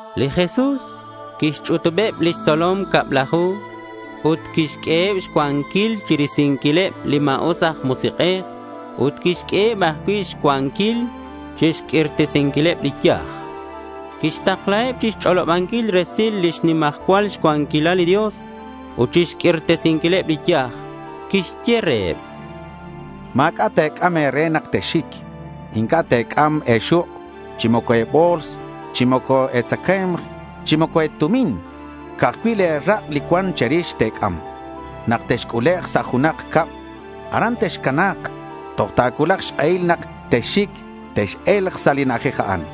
Li Jesús quixch'utubeb lix tzolom cablaju ut quixq'ueheb xcuanquil chirisinquileb li ma̱us aj musik'ej ut quixq'ueheb ajcui' xcuanquil chixq'uirtesinquileb li yaj. Quixtaklaheb chixch'olobanquil resil lix nimajcual cuanquilal li Dios ut chixq'uirtesinquileb li yaj. Quixye reheb: —Ma̱c'a' te̱c'am e̱re nak texxic. Inc'a' te̱c'am e̱xuk', chi moco e̱bo̱ls, chi moco e̱tzacae̱mk chi moco e̱tumin. Ca'aj cui' le̱ rak' li cuan che̱rix te̱c'am. Nak texc'ulek' sa' junak cab, aran texcana̱k. Toj ta̱cuulak xk'ehil nak texxic, tex-e̱lk sa' li na'ajej a'an.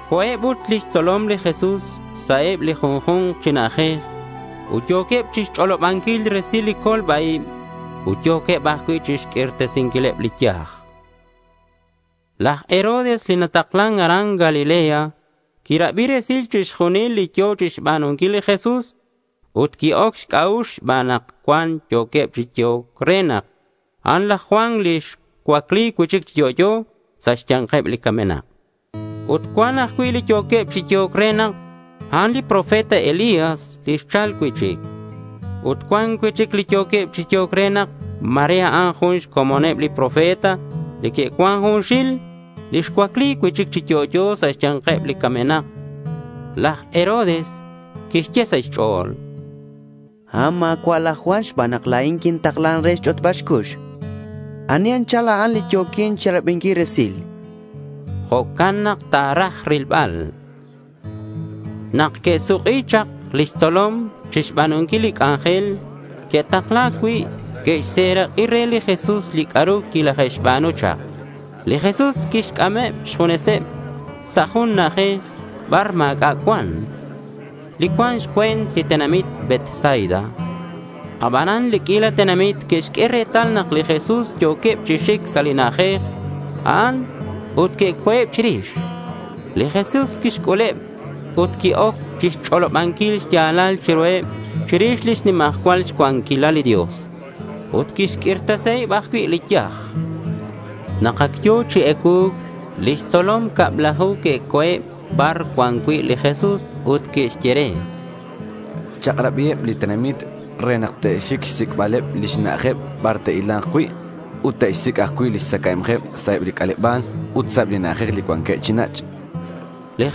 Co̱eb ut lix tzolom li Jesús sa' eb li junju̱nk chi na'ajej ut yo̱queb chixch'olobanquil resil li colba-ib. Ut yo̱queb ajcui' chixq'uirtesinquileb li yaj. Laj Herodes li nataklan aran Galilea quirabi resil chixjunil li yo̱ chixba̱nunquil li Jesús ut qui-oc xc'a'ux xban nak cuan yo̱queb chi yehoc re nak a'an laj Juan li xcuacli cui'chic chi yo'yo sa' xya̱nkeb li camenak. Ut cuan ajcui' li yo̱queb chi yehoc re nak a'an li profeta Elías li xchal cui'chic. Ut cuan cui'chic li yo̱queb chi yehoc re nak ma̱re a'an jun xcomoneb li profeta li que'cuan junxil li xcuacli cui'chic chi yo'yo sa' xya̱nkeb li camenak. Laj Herodes quixye sa' xch'o̱l: —A'an ma̱cua' laj Juan xban nak la̱in quintaklan re xch'otbal xcux. ¿Ani anchal a'an li yo̱quin chirabinquil resil? chan. Jo'can nak ta̱raj rilbal ru. Nak que'suk'i chak lix tzolom chixba̱nunquil li c'anjel que'takla̱c cui', que'xserak'i re li Jesús li c'a'ru quilaje'xba̱nu chak. Li Jesús quixc'ameb xjuneseb sa' jun na'ajej bar ma̱c'a' cuan, li cuan xcue̱nt li tenamit Betsaida. Abanan li q'uila tenamit que'xq'ue retal nak li Jesús yo̱queb chi xic sa' li na'ajej a'an, ut que'co̱eb chirix. Li Jesús quixc'uleb ut qui-oc chixch'olobanquil xya̱lal chiruheb chirix lix nimajcual cuanquilal li Dios. Ut quixq'uirtesiheb ajcui' li yaj. Nak ac yo̱ chi ecuu̱c, lix tzolom cablaju que'co̱eb bar cuan cui' li Jesús ut que'xye re: —Chak'rabiheb li tenamit re nak te'xic xsic'bal lix na'ajeb bar te'hila̱nk cui' ut te'xsic' ajcui' lix tzacae̱mk sa' eb li c'aleba̱l ut sa' eb li na'ajej li cuanqueb chi nach', chanqueb re.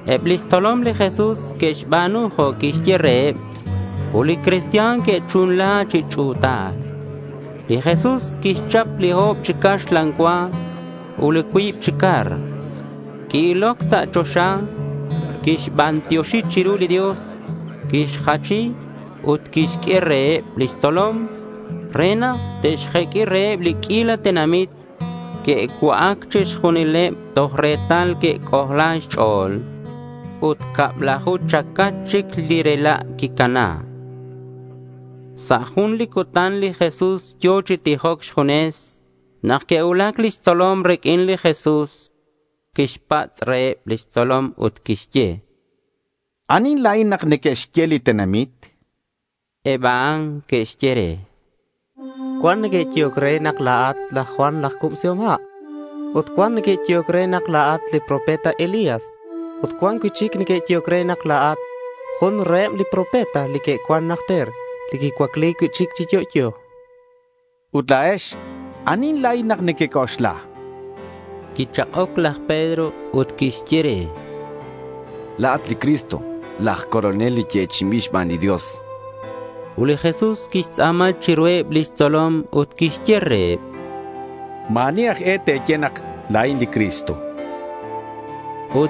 Eb lix tzolom li Jesús que'xba̱nu jo' quiyehe' reheb. Ut li cristian que'chunla chi ch'u̱tal. Li Jesús quixchap li o̱b chi caxlan cua ut li cuib chi car. Qui-iloc sa' choxa. Quixbantioxi chiru li Dios. Quixjachi ut quixq'ue reheb lix tzolom re nak te'xjeq'ui reheb li q'uila tenamit. Que'cua'ac chixjunileb toj retal que'c'ojla xch'o̱l. Ut cablaju chacach chic li rela' quicana. Sa' jun li cutan li Jesús yo̱ chi tijoc xjunes nak que'cuulac lix tzolom riq'uin. Li Jesús quixpatz' reheb lix tzolom ut quixye: —¿Anihin la̱in nak neque'xye li tenamit? chan. Eb a'an que'xye re: —Cuan neque'yehoc re nak la̱at laj Juan laj Cubsihom Ha'. Ut cuan ajcui' neque'yehoc re nak la̱at li profeta Elías. Ut cuan cui'chic neque'yehoc re nak la̱at jun reheb li profeta li que'cuan najter li xcuacli cui'chic chi yo'yo, chanqueb. —Ut la̱ex, ¿anihin la̱in nak nequec'oxla? chan li Jesús reheb. Quichak'oc laj Pedro ut quixye re: —La̱at li Cristo, laj Colonel li yechi'inbil xban li Dios, chan. Ut li Jesús quixtz'a̱ma chiruheb lix tzolom ut quixye reheb: —Ma̱ ani aj e te̱ye nak la̱in li Cristo, chan reheb.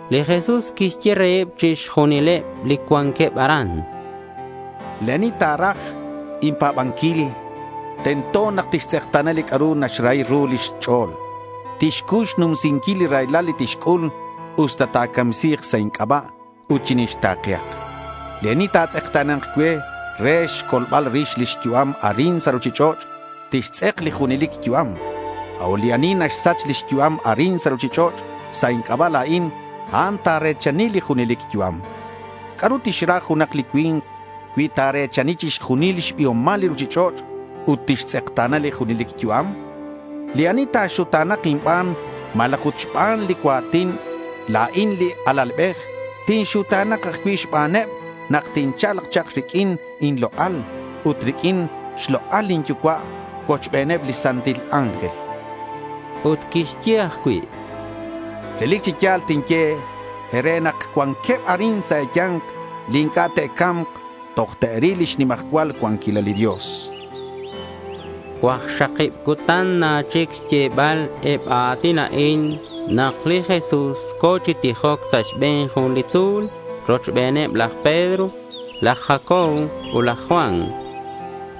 Li Jesús quixye reheb chixjunileb li cuanqueb aran: —Li ani ta̱raj inpa̱banquil tento nak tixtz'ekta̱na li c'a'ru naxrahi ru lix ch'o̱l. Tixcuy xnumsinquil li raylal li tixc'ul, usta ta̱camsi̱k sa' inc'aba'. Ut chinixta̱kehak. Li ani ta̱tz'ekta̱na̱nk cue re xcolbal rix lix yu'am arin sa' ruchich'och', tixtz'ek li junelic yu'am. A'ut li ani naxsach lix yu'am arin sa' ruchich'och' sa' inc'aba' la̱in, a'an ta̱re̱chani li junelic yu'am. ¿C'a'ru tixra junak li cui̱nk cui ta̱re̱chani chixjunil xbiomal li ruchich'och' ut tixtz'ekta̱na li junelic yu'am? Li ani ta̱xuta̱na̱k inban malaj ut xban li cua̱tin, la̱in li Alalbej tinxuta̱na̱k ajcui' xbaneb nak tincha̱lk chak riq'uin inlok'al ut riq'uin xlok'al lin Yucua' cuochbeneb li santil ángel, chan li Jesús. Ut quixye ajcui': —Relic chi ya̱l tinye e̱re nak cuanqueb arin sa' e̱ya̱nk li inc'a' te'ca̱mk toj te'ril lix nimajcual cuanquilal li Dios, chan li Jesús. Cuakxakib cutan na chic xyebal eb a a̱tin a'in nak li Jesús co̱ chi tijoc sa' xbe̱n jun li tzu̱l rochbeneb laj Pedro, laj Jacobo ut laj Juan.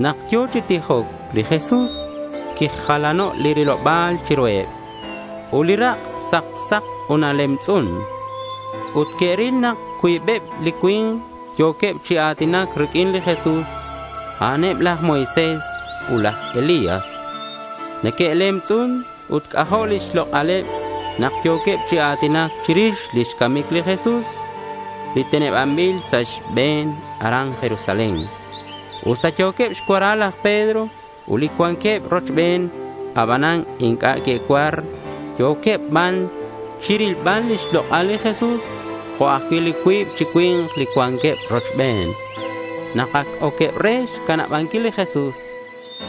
Nak yo̱ chi tijoc li Jesús, quijalano' li riloba̱l chiruheb. Ut li rak' sak sak ut nalemtz'un. Ut que'ril nak cuibeb li cui̱nk yo̱queb chi a̱tinac riq'uin li Jesús. A'aneb laj Moisés ut laj Elías. Neque'lemtz'un ut c'ajo' lix lok'aleb nak yo̱queb chi a̱tinac chirix lix camic li Jesús li tenebanbil sa' xbe̱n aran Jerusalén. Usta yo̱queb xcuara laj Pedro ut li cuanqueb rochben, abanan inc'a' que'cuar. Yo̱queb ban chirilbal lix lok'al li Jesús jo' ajcui' li cuib chi cui̱nk li cuanqueb rochben. Nak ac oqueb re xcanabanquil li Jesús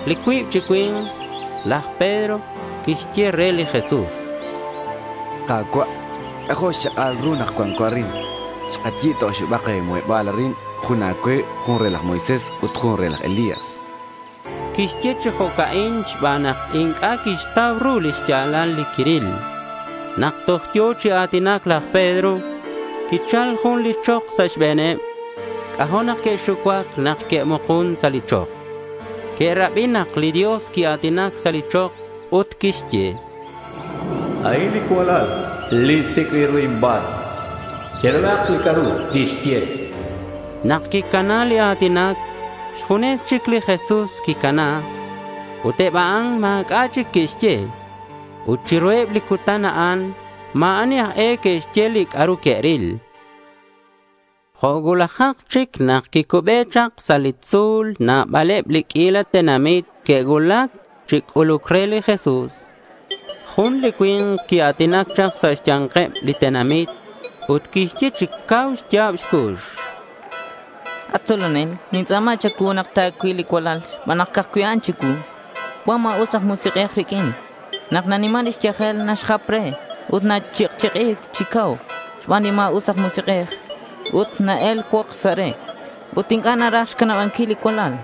li cuib chi cui̱nk, laj Pedro quixye re li Jesús: —Ka̱cua', c'ajo' xchak'al ru nak cuanco arin. Xkayi̱b ta oxibak muheba̱l arin. Jun a̱cue, jun re laj Moisés ut jun re laj Elías, chan. Quixye chi jo'can xban nak inc'a' quixtau ru li xya̱lal li quiril. Nak toj yo̱ chi a̱tinac laj Pedro, quichal jun li chok sa' xbe̱neb. C'ajo' nak que'xucuac nak que'mukun sa' li chok. Que'rabi nak li Dios quia̱tinac sa' li chok ut quixye: —A'in li cualal li sic'bil ru inban. Cherabi li c'a'ru tixye, chan. Nak quicana li a̱tinac, xjunes chic li Jesús quicana. Ut eb a'an ma̱c'a' chic que'xye. Ut chiruheb li cutan a'an ma̱ ani aj e que'xye li c'a'ru que'ril. Jo' cuulajak chic nak quicube sa' li tzu̱l, nabaleb li q'uila tenamit que'cuulac chi c'uluc re li Jesús. Jun li cui̱nk quia̱tinac chak sa' xya̱nkeb li tenamit ut quixye chi cau xya̱b xcux: —At tzolonel, nintz'a̱ma cha̱cuu nak ta̱cuil li cualal xban nak ca'aj cui' a'an chicuu. Cuan ma̱us aj musik'ej riq'uin. Nak naniman xyajel naxjap re ut nach'ikch'iki̱c chi cau xban li ma̱us aj musik'ej ut na-el xcuokx sa' re. Ut inc'a' naraj xcanabanquil li cualal.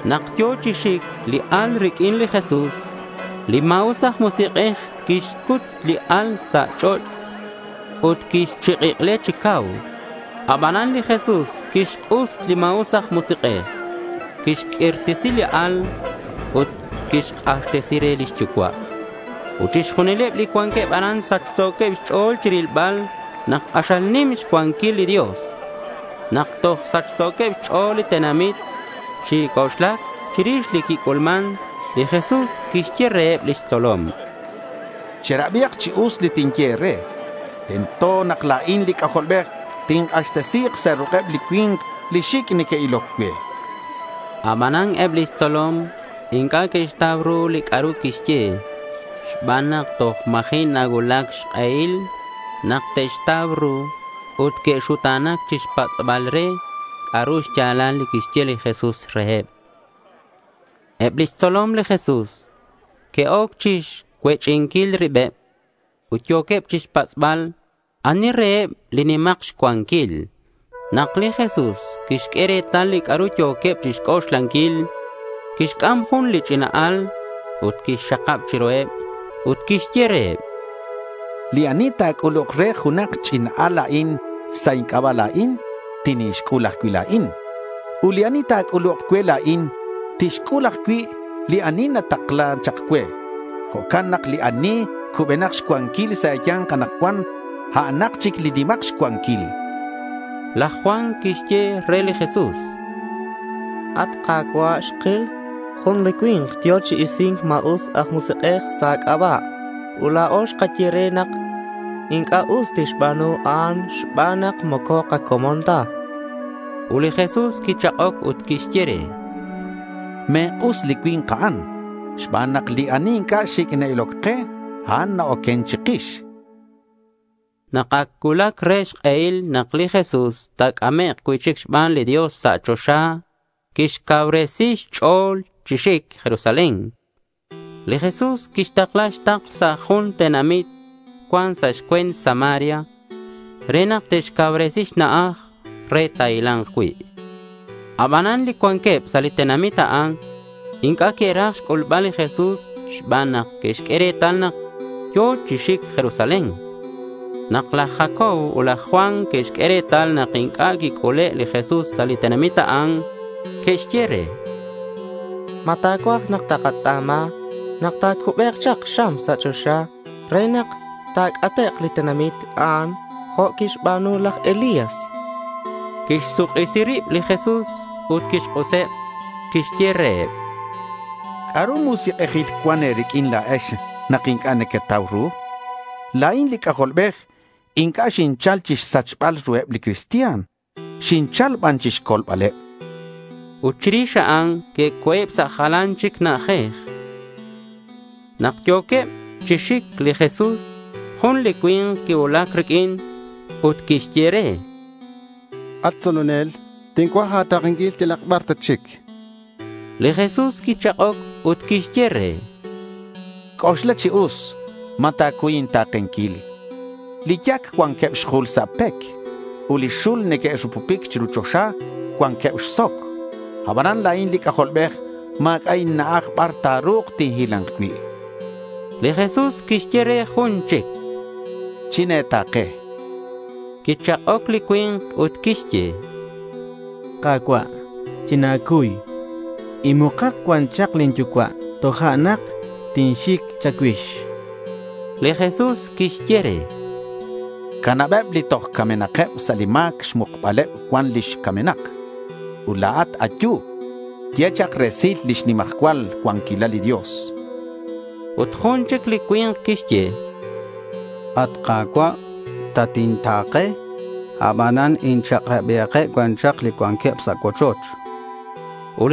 Nak yo̱ chi xic li al riq'uin li Jesús, li ma̱us aj musik'ej quixcut li al sa' ch'och' ut quixch'ikle chi cau. Abanan li Jesús quixk'us li ma̱us aj musik'ej. Quixq'uirtesi li al ut quixk'axtesi re lix yucua'. Ut chixjunileb li cuanqueb aran sachso̱queb xch'o̱l chirilbal nak k'axal nim xcuanquil li Dios. Nak toj sachso̱queb xch'o̱l li tenamit chi c'oxlac chirix li quic'ulman, li Jesús quixye reheb lix tzolom: —Cherabihak chi us li tinye e̱re. Tento nak la̱in li C'ajolbej tink'axtesi̱k sa' ruk'eb li cui̱nk li xic' neque'iloc cue, chan li Jesús. Abanan eb lix tzolom inc'a' que'xtau ru li c'a'ru quixye, xban nak toj ma̱ji' nacuulac xk'ehil nak te'xtau ru. Ut que'xuta̱nac chixpatz'bal re c'a'ru xya̱lal li quixye li Jesús reheb. Eb lix tzolom li Jesús que'oc chixcuech'inquil ribeb. Ut yo̱queb chixpatz'bal ani reheb li nimak xcuanquil. Nak li Jesús quixq'ue retal li c'a'ru yo̱queb chixc'oxlanquil, quixc'am jun li ch'ina al ut quixxakab chiru. Ut quixye reheb: —Li ani ta̱c'uluk re junak ch'ina al jo' a'in sa' inc'aba' la̱in, tinixc'ul ajcui' la̱in; ut li ani ta̱c'uluk cue la̱in, tixc'ul ajcui' li ani xtaklan chak cue. Jo'can nak li ani cubenak xcuanquil sa' e̱ya̱nk anakcuan, a'anak chic li nimak xcuanquil. Laj Juan quixye re li Jesús: —At Ka̱cua', xkil jun li cui̱nk yo̱ chi isi̱nc ma̱us aj musik'ej sa' a̱c'aba'. Ut la̱o xkaye re nak inc'a' tixba̱nu a'an xban nak moco kacomon ta, chan. Ut li Jesús quichak'oc ut quixye re: —Me̱k'us li cui̱nk a'an xban nak li ani inc'a' xic' na-iloc ke, a'an na-oquen chikix, chan. Nak ac cuulac re xk'ehil nak li Jesús ta̱c'amek' cui'chic xban li Dios sa' choxa, quixcacuubresi xch'o̱l chi xic Jerusalén. Li Jesús quixtakla xtakl sa' jun tenamit cuan sa' xcue̱nt Samaria, re nak te'xcauresi xna'aj re ta̱hila̱nk cui'. Abanan li cuanqueb sa' li tenamit a'an inc'a' que'raj xc'ulbal li Jesús xban nak que'xq'ue retal nak yo̱ chi xic Jerusalén. Nak laj Jacobo ut laj Juan que'xq'ue retal nak inc'a' quic'ule' li Jesús sa' li tenamit a'an, que'xye re: —¿Ma ta̱cuaj nak takatz'a̱ma nak ta̱cubek chak xam sa' choxa re nak ta̱c'atek' li tenamit a'an jo' quixba̱nu laj Elías? chanqueb. Quixsuk'isi rib li Jesús ut quixk'useb. Quixye reheb: —¿C'a'ru musik'ejil cuan e̱riq'uin la̱ex nak inc'a' nequetau ru? La̱in li C'ajolbej inc'a' xinchal chixsachbal ruheb li cristian. Xinchal ban chixcolbaleb, chan li Jesús. Ut chirix a'an, que'co̱eb sa' jalan chic na'ajej. Nak yo̱queb chi xic li Jesús, jun li cui̱nk quicuulac riq'uin ut quixye re: —At tzolonel, tincuaj a̱ta̱kenquil yalak bar tatxic, chan re. Li Jesús quichak'oc ut quixye re: —C'oxla chi us ma ta̱cuy inta̱kenquil. Li yac cuanqueb xjul sa' pec, ut li xul li neque'rupupic chiru choxa cuanqueb xsoc. Abanan la̱in li C'ajolbej ma̱c'a' inna'aj bar ta̱ru̱k tinhila̱nk cui'.— Li Jesús quixye re jun chic: —China̱ta̱ke, chan. Quichak'oc li cui̱nk ut quixye: —Ka̱cua', china̱cuy. Inmukak cuan lin yucua' tojo'nak tinxic cha̱cuix, chan. Li Jesús quixye re: —Canabeb li toj camenakeb sa' li ma̱c xmukakeb cuan lix camenak. Ut la̱at, ayu. Ye chak resil lix nimajcual cuanquilal li Dios, chan. Ut jun chic li cui̱nk quixye: —At Ka̱cua', tatinta̱ke. Abanan inchak'rabihakeb cuan chak li cuanqueb sa' cuochoch, chan re.